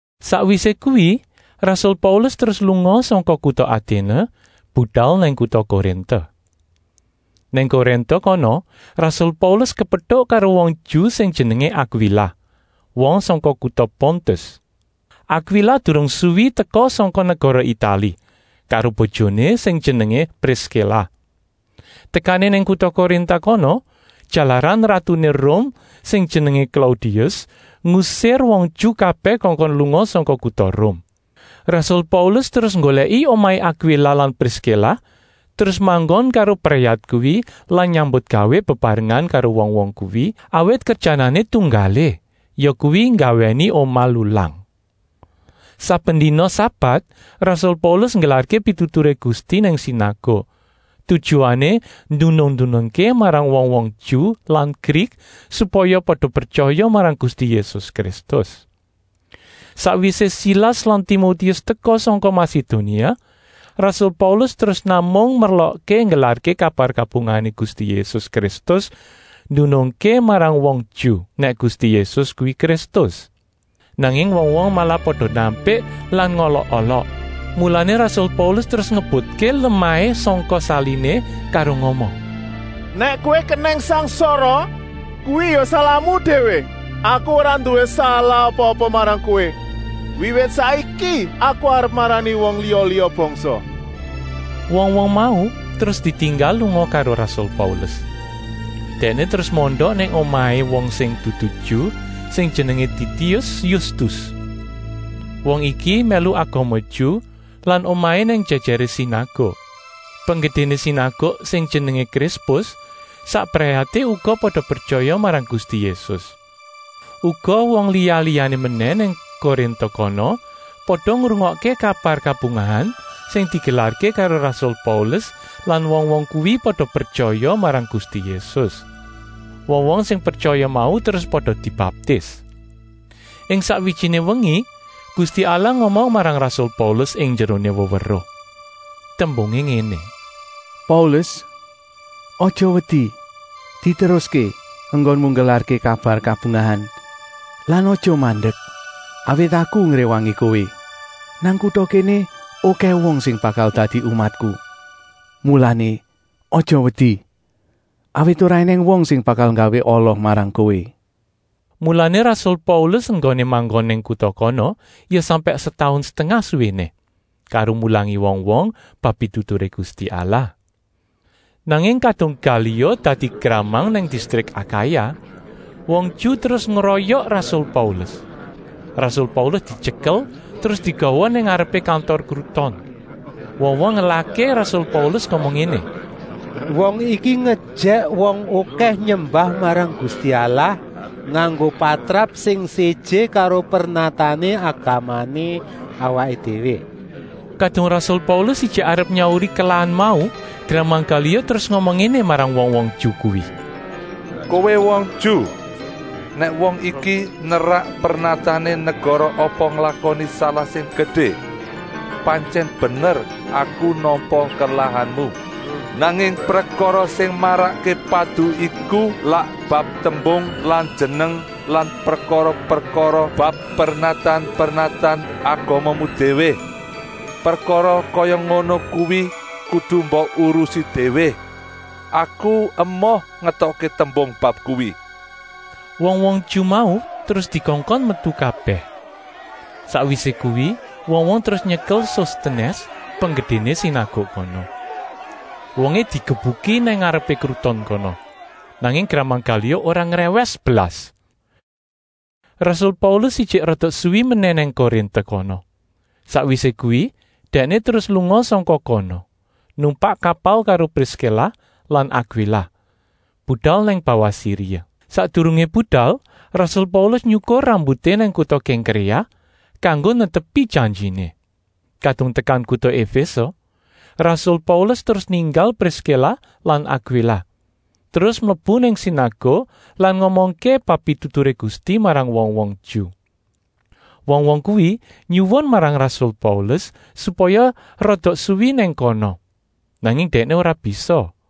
Sakwisé kuwi rasul Paulus terus lunga sangka kuta Aténe budal nang kuta Korinta. Nang Korinta kono rasul Paulus kepetuk karo wong Ju sing jenengé Akwila, wong sangka kuta Pontus. Akwila durung suwi teka sangka negara Itali karo bojoné sing jenengé Priskila. Tekané nang kuta Korinta kono, jalaran ratuné Rum sing jenengé Klaudius, ngusir wong Ju kabèh kongkon lunga sangka kuta Rum. Rasul Paulus terus nggolèki omahé Akwila lan Priskila terus manggon karo brayat kuwi lan nyambutgawé bebarengan karo wong-wong kuwi, awit kerjanané tunggalé, yakuwi nggawèni omah lulang. Saben dina sabat rasul Paulus nggelarké pituturé Gusti nang sinaguk, tujuané ndunung-ndunungké marang wong-wong Ju lan Grik, supaya pada pretyaya marang Gusti Yésus Kristus. Sakwisé Silas lan Timotius teka sangka Masedonia, rasul Paulus terus namung merlokké nggelarké kabar kabungahané Gusti Yésus Kristus, ndunungké marang wong Ju, nèk Gusti Yésus kuwi Kristus. Nanging wong-wong malah pada nampik lan ngolok-olok, mulané rasul Paulus terus ngebutké lemahé sangka saliné karo ngomong: “Nèk kowé kenèng sangsara, kuwi ya salahmu déwé. Aku ora nduwé salah apa-apa marang kowé. Wiwit saiki aku arep marani wong liya-liya bangsa.” Wong-wong mau terus ditinggal lunga karo rasul Paulus. Dèkné terus mondok nang omahé wong sing dudu Ju sing jenengé Titius Yustus. Wong iki mèlu agama Ju lan omahé nang jèjèré sinaguk. Penggedéné sinaguk sing jenengé Krispus sak brayaté uga pada pretyaya marang Gusti Yésus. Uga wong liya-liyané menèh nang Korinta kono pada ngrungokké kabar kabungahan sing digelarké karo rasul Paulus lan wong-wong kuwi pada pretyaya marang Gusti Yésus. Wong-wong sing pretyaya mau terus pada dibaptis. Ing sakwijiné wengi Gusti Allah ngomong marang rasul Paulus ing njeroné weweruh. Tembungé ngéné: “Paulus, aja wedi! Diteruské enggonmu nggelarké kabar kabungahan lan aja mandek, awit Aku ngréwangi kowé. Nang kuta kéné okèh wong sing bakal dadi umatku, mulané aja wedi, awit ora ènèng wong sing bakal nggawé ala marang kowé.” Mulané rasul Paulus enggoné manggon nang kuta kono ya sampèk setaun setengah suwéné, karo mulangi wong-wong bab pituturé Gusti Allah. Nanging kadung Galio dadi gramang nang distrik Akaya, wong Ju terus ngroyok rasul Paulus. Rasul Paulus dityekel terus digawa nang ngarepé kantor kruton. Wong-wong ngelahké rasul Paulus ngomong ngéné: “Wong iki ngejèk wong okèh nyembah marang Gusti Allah nganggo patrap sing séjé karo pernatané agamané awaké déwé.” Kadung rasul Paulus ijik arep nyauri kelahan mau, gramang Galio terus ngomong ngéné marang wong-wong Ju kuwi: “Kowé wong Ju, nèk wong iki nerak pernatané negara apa nglakoni salah sing gedé, pantyèn bener aku nampa kelahanmu. Nanging prekara sing marakké padu iku lak bab tembung lan jeneng lan prekara-prekara bab pernatan-pernatan agamamu déwé. Prekara kaya ngono kuwi kudu mbok urusi déwé. Aku emoh ngetokké tembung bab kuwi!” Wong-wong Ju mau terus dikongkon metu kabèh. Sakwisé kuwi wong-wong terus nyekel Sostenès, penggedéné sinaguk kono. Wongé digebuki nang ngarepé kruton kono. Nanging gramang Galio ora ngrèwès blas. Rasul Paulus ijik rada suwi menèh nang Korinta kono. Sakwisé kuwi dèkné terus lunga sangka kono, numpak kapal karo Priskila lan Akwila, budal nang bawah Siria. Sakdurungé budal rasul Paulus nyukur rambuté nang kuta Kèngkréa, kanggo netepi janjiné. Kadung tekan kuta Efése, rasul Paulus terus ninggal Priskila lan Akwila, terus mlebu nang sinaguk lan ngomongké bab pituturé Gusti marang wong-wong Ju. Wong-wong kuwi nyuwun marang rasul Paulus, supaya rada suwi nang kono, nanging dèkné ora bisa.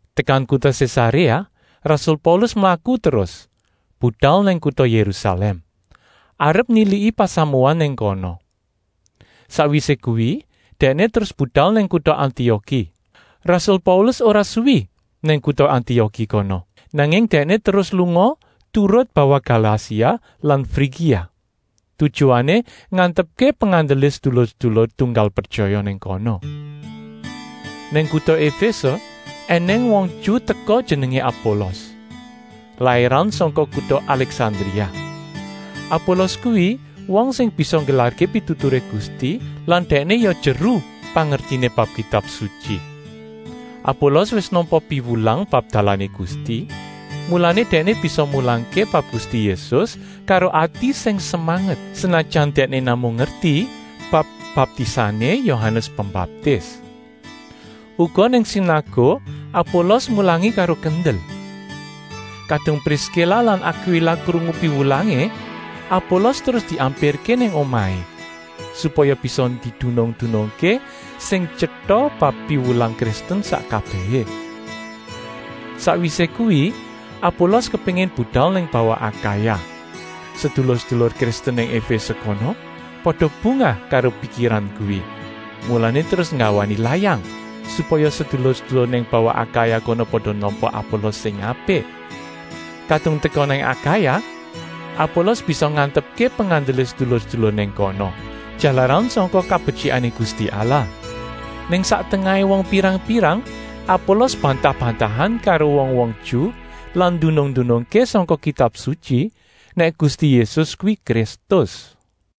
Tekan kuta Sésaréa rasul Paulus mlaku terus, budal nang kuta Yérusalèm, arep niliki pasamuan nang kono. Sakwisé kuwi dèkné terus budal nang kuta Antioki. Rasul Paulus ora suwi nang kuta Antioki kono, nanging dèkné terus lunga turut bawah Galasia lan Frigia, tujuané ngantepké pengandelé sedulur-sedulur tunggal pretyaya nang kono. Nang kuta Efése ènèng wong Ju teka sing jenengé Apolos, lairan sangka kuta Alèksandria. Apolos kuwi wong sing bisa nggelarké pituturé Gusti lan dèkné ya jeru pangertiné bab Kitab Sutyi. Apolos wis nampa piwulang bab dalané Gusti, mulané dèkné bisa mulangké bab Gusti Yésus karo ati sing semanget, senajan dèkné namung ngerti bab baptisané Yohanes Pembaptis. Uga nang sinaguk Apolos mulangi karo kendel. Kadung Priskila lan Akwila krungu piwulangé, Apolos terus diampirké nang omahé, supaya bisa didunung-dunungké sing tyeta bab piwulang Kristen sak kabèhé. Sakwisé kuwi Apolos kepéngin budal nang bawah Akaya. Sedulur-sedulur Kristen nang Efése kono pada bungah karo pikiran kuwi, mulané terus nggawani layang, supaya sedulur-sedulur nang bawah Akaya kono pada nampa Apolos sing apik. Kadung teka nang Akaya, Apolos bisa ngantepké pengandelé sedulur-sedulur nang kono, jalaran sangka kabetyikané Gusti Allah. Nang sak tengahé wong pirang-pirang Apolos bantah-bantahan karo wong-wong Ju lan ndunung-ndunungké sangka Kitab Sutyi, nèk Gusti Yésus kuwi Kristus.